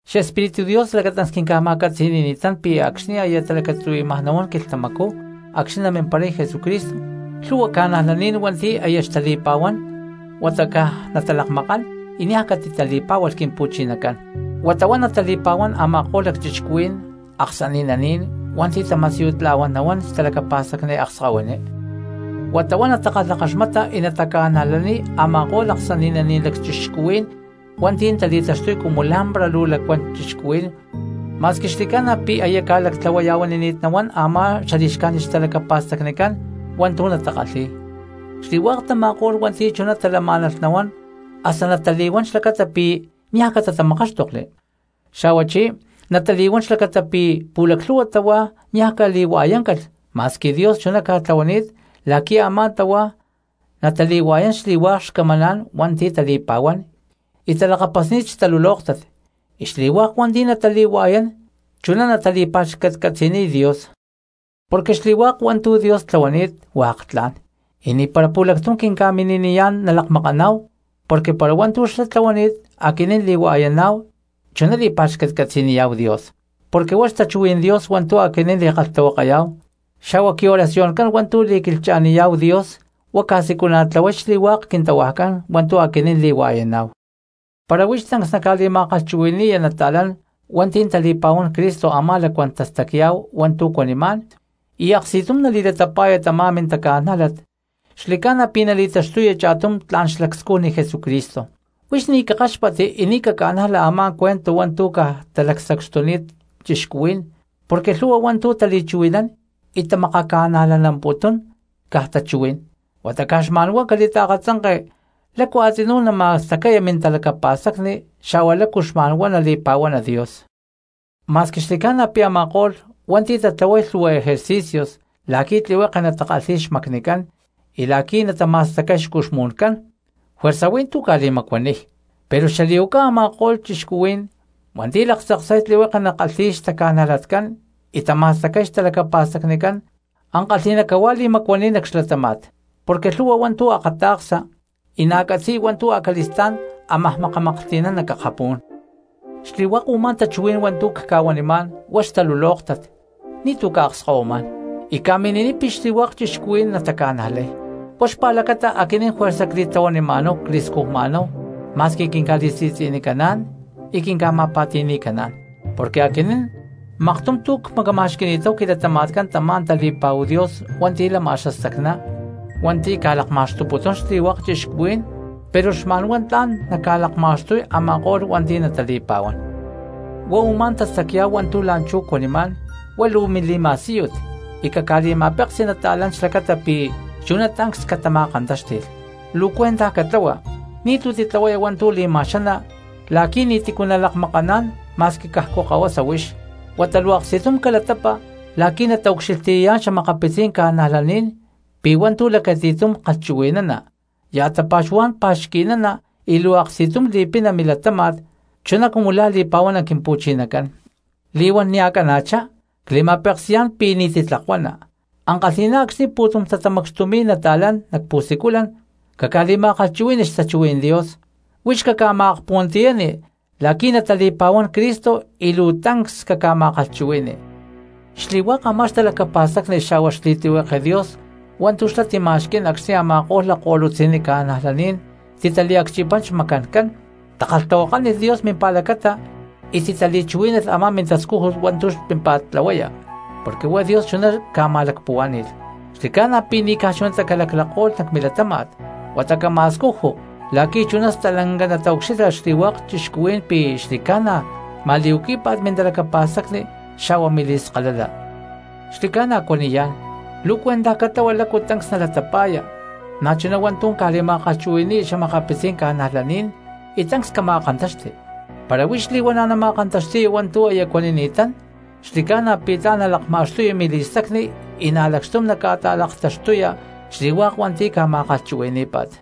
Xespíritu Dios lacatancs quima̠catzi̠ni̠ni̠t pi̠ acxni̠ aya talacatzuhui̠maj nahuán quilhtamacú acxni̠ namimparay Jesucristo, lhu̠hua cristianos hua̠nti̠ aya xtali̠pa̠huán huata caj natalakmakán y niaj catitali̠pá̠hualh Quimpu̠chinacán, huata huá natali̠pa̠huán a̠ma̠ko̠lh lacchixcuhuí̠n aksani̠naní̠n hua̠nti̠ tama̠siyutla̠huán nahuán xtalacapa̠stacni akskahuiní. Huata huá natakalhakaxmata y nataca̠najlaniy a̠ma̠ko̠lh aksani̠naní̠n lacchixcuhuí̠n hua̠nti̠ tali̠taxtuy cumu lá̠mpara luu lacuán cristianos ma̠squi xli̠ca̠na pi̠ aya ca̠lactlahuaya̠huani̠t nahuán a̠má xali̠xcájnit xtalacapa̠stacnicán hua̠ntu̠ natakalhi̠y. Xli̠hua̠k tama̠ko̠lh hua̠nti̠ chuná talamá̠nalh nahuán hasta natali̠huán xlacata pi̠ niaj catatamakáxtokli, xa̠huachí natali̠huán xlacata pi̠ pu̠laclhu̠hua tahuá niaj cali̠hua̠yáncalh ma̠squi Dios chuná ca̠tlahuani̠t la̠qui̠ a̠má tahuá natali̠hua̠yán xli̠hua̠k xcamaná̠n hua̠nti̠ tali̠pa̠huán y talakapasni̠t xtalulóktat, y xli̠hua̠k hua̠nti̠ natali̠hua̠yán chuná natali̠pa̠xcatcatzi̠niy Dios. Porque xli̠hua̠k hua̠ntu̠ Dios tlahuani̠t hua̠k tla̠n, y ni̠para pu̠lactum quinca̠mini̠niyá̠n nalakmakaná̠hu porque para hua̠ntu̠ xlá tlahuani̠t aquinín li̠hua̠yaná̠hu chuná li̠pa̠xcatcatzi̠niyá̠hu Dios. Porque huá xtachuhuí̠n Dios hua̠ntu̠ aquinín li̠kalhtahuakayá̠hu xa̠hua quioracioncán hua̠ntu̠ li̠quilhcha̠niyá̠hu Dios huá ca̠siculana̠tlahuay xli̠hua̠k quintahuajcán hua̠ntu̠ aquinín li̠hua̠yaná̠hu. Para huix tancs naca̠li̠ma̠kalhchuhui̠ni̠ya nata̠lán hua̠nti̠ tali̠pa̠huán Cristo u̠má lacuán tastacya̠hu hua̠ntu̠ cuanimá̠n, y aksti̠tum nali̠latapa̠ya tamá mintaca̠nájlat, xli̠ca̠na pi̠ nali̠taxtuya cha̠tum tla̠n xlacscujni Jesucristo. Huix ni̠ cakáxpatti y ni̠ caca̠najla a̠má cuento hua̠ntu̠ caj talacsacxtuni̠t cristianos, porque lhu̠hua hua̠ntu̠ tali̠chuhui̠nán y tamakaca̠najlanamputún, caj tachui̠n huata caj xma̠n huá cali̠taakatzanke lácu a̠tzinú nama̠stacaya mintalacapa̠stacni xa̠hua lácu xma̠n huá nali̠pa̠huana Dios. Ma̠squi xli̠ca̠na pi̠ a̠ma̠ko̠lh hua̠nti̠ tatlahuay lhu̠hua ejercicios la̠qui̠ tlihueke natakalhi̠y xmacnicán y la̠qui̠ natama̠stacay xcuxmu̠ncán, juerza hui̠ntú ca̠li̠macuaniy, pero xali̠huaca a̠ma̠ko̠lh cristianos hua̠nti̠ talaktzaksay tlihueke natakalhi̠y xtaca̠najlatcán y tama̠stacay xtalacapa̠stacnicán ankalhi̠ná cahuá li̠macuaniy nac xlatáma̠t, porque lhu̠hua hua̠ntu̠ akata̠ksa y na̠ catzi̠y hua̠ntu̠ acali̠stá̠n ámaj makamaklhti̠nán nac akapú̠n. Xli̠hua̠k u̠má tachuhuí̠n hua̠ntu̠ cca̠huanimá̠n huá xtalulóktat ni̠tu̠ cca̠akskahuimá̠n, y ca̠mini̠niy pi̠ xli̠hua̠k cristianos nataca̠najlay. Huá xpa̠lacata aquinín juerza cli̠tlahuanima̠náhu cli̠scujma̠náhu ma̠squi quinca̠li̠si̠tzi̠nicaná̠n y quinca̠ma̠pa̠ti̠ni̠caná̠n, porque aquinín maktum tu̠ cmacama̠xqui̠ni̠táhu quilatama̠tcán tamá tali̠pa̠hu Dios hua̠nti̠ lama xastacná hua̠nti̠ ca̠lakma̠xtuputún xli̠hua̠k cristianos, pero xma̠nhuá tla̠n naca̠lakma̠xtuy a̠ma̠ko̠lh hua̠nti̠ natali̠pa̠huán. Huá u̠má tastacya̠hu hua̠ntu̠ la̠nchú cuanimá̠n, huá luu mili̠ma̠síyut y caca̠li̠ma̠peksi cristianos xlacata pi̠ chuná tancs catama̠kantáxti̠lh. Luu cuentaj catlahua ni̠tu̠ titlahuaya hua̠ntu̠ li̠ma̠xana la̠qui̠ ni̠ti̠cu nalakmakaná̠n ma̠squi cajcu kahuasa huix, huata luu aksti̠tum calatapa la̠qui̠ nataucxilhtiyayá̠n xa̠makapitzí̠n ca̠najlaní̠n pi̠ hua̠ntu̠ lacati̠tum kalhchuhui̠nana, ya̠ tapa̠xuhuá̠n pa̠xqui̠nana y luu aksti̠tum li̠pina milatáma̠t, chu li̠pa̠huana Quimpu̠chinacán. Li̠huán nia̠ cana̠chá cli̠ma̠peksi̠yá̠n pi̠ ni̠ titlakuana, ankalhi̠ná acxni̠ pu̠tum tatamacxtumi̠y cristianos nac pu̠siculan caca̠li̠kalhtahuakani xtachuhuí̠n Dios, huix caca̠ma̠akpuhuantiyani la̠qui̠ natali̠pa̠huán Cristo y luu tancs caca̠ma̠kalhchuhui̠ni. Xli̠hua̠k a̠má xtalacapa̠stacni xa̠hua xli̠tlihueke Dios hua̠ntu̠ xlá tima̠xquí̠n acxni̠ a̠ma̠ko̠lh lakko̠lutzi̠nni ca̠najlaní̠n taliacchipán xmacancán, takalhtahuakánilh Dios mimpa̠lacata y titali̠chuhuí̠nalh a̠má mintascújut hua̠ntu̠ xpímpa̠t tlahuaya porque huá Dios chuná ca̠ma̠lacpuhuá̠ni̠lh, xli̠ca̠na pi̠ ni̠ caj chunatá calaclako̠lh nac milatama̠t, huata cama̠scuju, la̠qui̠ chuná stalanca nataucxilha xli̠hua̠k cristianos pi̠ xli̠ca̠na ma̠li̠huaquí̠pa̠t mintalacapa̠stacni xa̠hua mili̠skalala. Xli̠ca̠na cuaniyá̠n, luu cuentaj catlahua lácu tancs nalatapa̠ya, na̠chuná hua̠ntu̠ ca̠li̠ma̠kalhchuhui̠ni̠ya xa̠makapitzí̠n cristianos y tancs cama̠kantaxti; para huix li̠huana̠ nama̠kantaxti̠ya hua̠ntu̠ aya cuanini̠tán xli̠ca̠na pi̠ tla̠n nalakma̠xtuya mili̠stacni y na̠ lacxtum naca̠ta̠laktaxtuya xli̠hua̠k hua̠nti̠ ca̠ma̠kalhchuhui̠ní̠pa̠t.